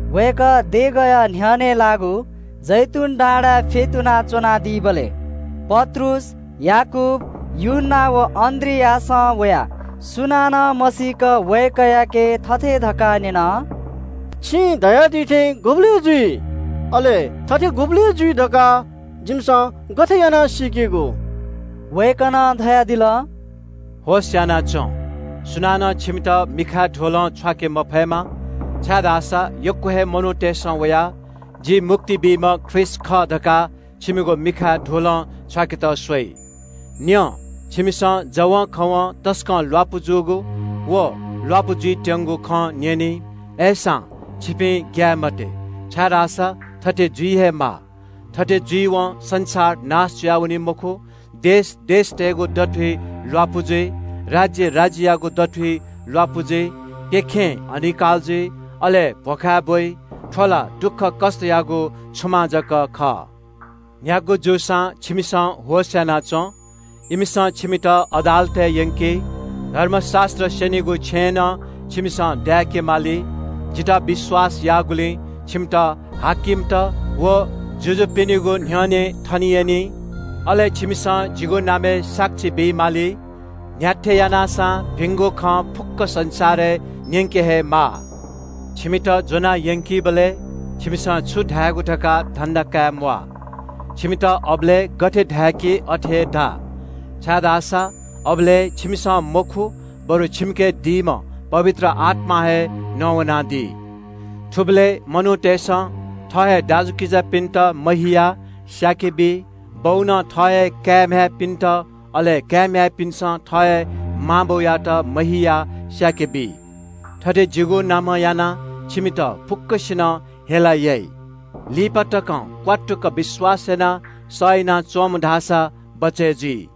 वय्‌कः देगःया न्‍ह्यःने लाःगु जैतून डाँडाय् फ्‍यतुना च्‍वनादीबलय् पत्रुस, याकूब, यूहन्‍ना व अन्‍द्रियासं वयाः सुनानं मसीक वय्‌कःयाके थथे धकाः न्‍यन – “छिं धयादी थें गुबलय् जुइ? अले थथे गुबलय् जुइ धकाः जिमिसं गथे यानाः सीकेगु?” वय्‌कलं धयादिल – “होश‍ यानाच्‍वँ, सुनानं छिमित मिखाय् धुलं छ्वाके मफयेमा, छाय्‌धाःसा यक्‍व हे मनूतय्‌सं वयाः – ‘जि मुक्ति बीम्‍ह ख्रीष्‍ट खः’ धकाः छिमिगु मिखाय् धुलं छ्वाकेत स्‍वइ। न्‍यँ, छिमिसं जवंखवं तसकं ल्‍वापु जूगु व ल्‍वापु जुइत्‍यंगु खँ न्‍यनी। अय्‌सां, छिपिं ग्‍याये मते, छाय्‌धाःसा थथे जुइ हे माः। थथे जुइवं संसार नाश जुयावनी मखु। देश देशतय्‌गु दथुइ ल्‍वापु जुइ। राज्‍य राज्‍ययागु दथुइ ल्‍वापु जुइ। प्‍यखें अनिकाल जुइ, अले भ्‍वखाय् ब्‍वइ। थ्‍व ला दुःखकष्‍टयागु छुमां जक खः।” “न्‍ह्यागु जूसां छिमिसं होश‍ यानाच्‍वँ। इमिसं छिमित अदालतय् यंकी, धर्मशास्‍त्र स्‍यनीगु छेँय् नं छिमिसं दाय्‌काः च्‍वनेमाली। जितः विश्‍वास याःगुलिं छिमित हाकिमत व जुजुपिनिगु न्‍ह्यःने थने यनी, अले छिमिसं जिगु नामय् साक्षी बी माली। न्‍ह्याथे यानाः सां भिंगु खँ फुक्‍क संसारय् न्‍यंके हे माः। छिमित ज्‍वना यंकीबलय् छिमिसं छु धायेगु धकाः धन्‍दा काये म्‍वाः। छिमित अबलय् गथे धाय्‌की अथे हे धा, छाय्‌धाःसा अबलय् छिमिसं मखु, बरु छिमिके दीम्‍ह पवित्र आत्‍मां हे नवानादी। “थुबलय् मनूतय्‌सं थः हे दाजुकिजापिन्‍त महियाः स्‍याके बी। बौनं थः हे काय् म्‍ह्याय्‌पिन्‍त, अले काय् म्‍ह्याय्‌पिन्‍सं थः हे मां बौयात महियाः स्‍याके बी। थथे जिगु नामं यानाः छिमित फुक्‍कसिनं हेला याइ। लिपा तकं क्‍वात्तुक विश्‍वास यानाः सह यानाच्‍वंम्‍ह धाःसा बचय् जुइ।”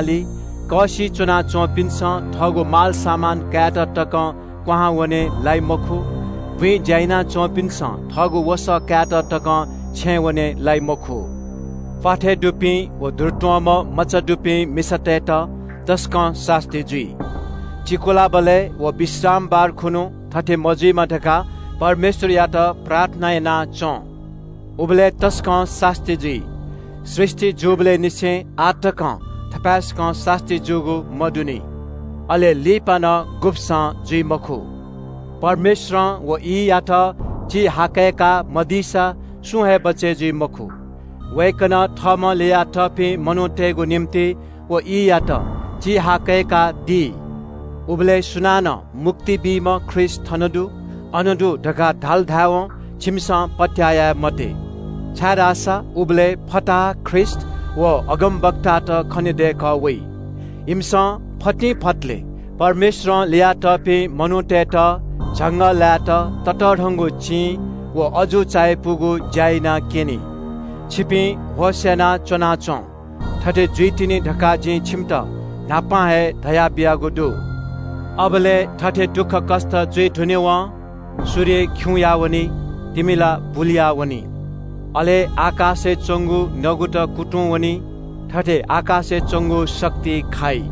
छेँय्‌या कःसिइ च्‍वनाच्‍वंपिन्‍सं थःगु मालसामान कायेत तकं क्‍वहां वने लाइ मखु। बुँइ ज्‍या याना च्‍वंपिन्‍सं थःगु वसः कायेत तकं छेँय् वने लाइ मखु। प्‍वाथय् दुपिं व दुरुत्‍वंम्‍ह मचा दुपिं मिसातय्‌त तसकं सास्‍ती जुइ। चिकुलाबलय् व विश्रामबार खुन्‍हु थथे मजुइमा धकाः परमेश्‍वरयात प्रार्थना याना च्‍वँ। उबलय् तसकं सास्‍ती जुइ। सृष्‍टि जूबलय् निसें आः तकं थपाय्‌सकं सास्‍ती जूगु मदुनि। अले लिपा नं गुब्‍सं जुइ मखु। परमेश्‍वरं व ईयात चिहाकय्‌का मदीसा सुं हे बचय् जुइ मखु। वय्‌कलं थःम्‍हं ल्‍ययातःपिं मनूतय्‌गु निंतिं व ईयात चिहाकय्‌कादी। “उबलय् सुनानं ‘मुक्ति बीम्‍ह ख्रीष्‍ट थन दु, अन दु’ धकाः धाल धाय्‌वं छिमिसं पत्‍याः याये मते, छाय्‌धाःसा उबलय् फताहा ख्रीष्‍ट व अगमवक्तात खनेदय्‌कः वइ। इमिसं फतिंफतलय् परमेश्‍वरं ल्‍ययातःपिं मनूतय्‌त झंगःलाय्‌त ततःधंगु चिं व अजू चायापुगु ज्‍या यानाक्‍यनी। छिपिं होश यानाः च्‍वनाच्‍वँ, थथे जुइतिनि धकाः जिं छिमित न्‍हापां हे धयाबियागु दु।” “अबलय् थथे दुःखकष्‍ट जुइ धुनेवं – “‘सूर्य खिउँया वनी, तिमिला बुलुयावनी। आकाशय् च्‍वंगु नगु कुतुं वनी। अले आकाशय् च्‍वंगु शक्ति खाइ।’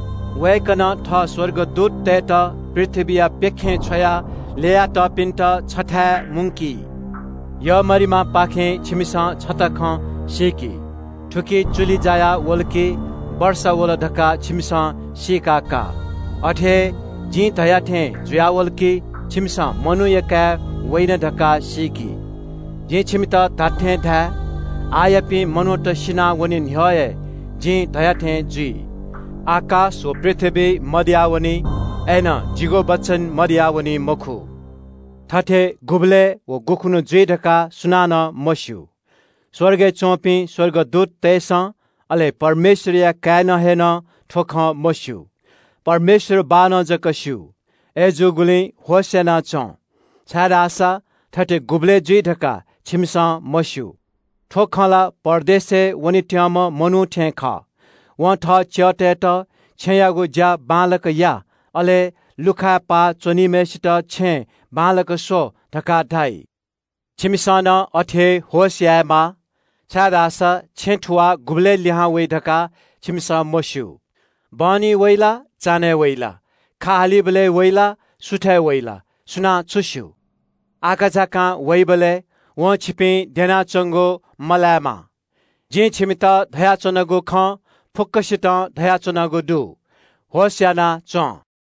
वय्‌कलं थः स्‍वर्गदूततय्‌त पृथ्‍वीया प्‍यखें छ्वयाः ल्‍ययातःपिन्‍त छथाय् मुंकी।” “यःमरिमापाखें छिमिसं छता खँ सीकि। थुकी चुलि जायावल कि वर्षा वल धकाः छिमिसं सी। अथे हे जिं धया थें जुयावल कि छिमिसं मनूया काय् वइन धकाः सीकि। जिं छिमित धात्‍थें धाये – आःयापिं मनूत सिनावने न्‍ह्यः हे जिं धया थें जुइ। आकाश व पृथ्‍वी मदयावनी, अय्‌नं जिगु वचन गुबलें मदयावनी मखु।” “थथे गुबलय् व गुखुन्‍हु जुइ धकाः सुनानं मस्‍यू। स्‍वर्गय् च्‍वंपिं स्‍वर्गदूततय्‌सं, अले परमेश्‍वरया काय्‌नं हे नं थ्‍व खँ मस्‍यू। परमेश्‍वर बाःनं जक स्‍यू। अय्‌जूगुलिं होश‍यानाच्‍वँ, छाय्‌धाःसा थथे गुबलय् जुइ धकाः छिमिसं मस्‍यू। “थ्‍व खँ ला परदेशय् वनेत्‍यंम्‍ह मनू थें खः। वं थः च्‍यःतय्‌त ‘छेँयागु ज्‍या बांलाक या,’ अले लुखाय् पाः च्‍वनीम्‍हय्‌सित ‘छेँय् बांलाक स्‍व’ धकाः धाइ। छिमिसं नं अथे हे होश यायेमाः, छाय्‌धाःसा छेँ थुवाः गुबलय् लिहां वइ धकाः छिमिसं मस्‍यू। बहनी वइ ला, चान्‍हय् वइ ला, खा हालीबलय् वइ ला, सुथय् वइ ला, सुनां छु स्‍यू? आकाझाकां वइबलय् वं छिपिं द्यनाच्‍वंगु मलायेमा। जिं छिमित धयाच्‍वनागु खँ फुक्‍कसितं धयाच्‍वनागु दु – ‘होश‍यानाच्‍वँ।’”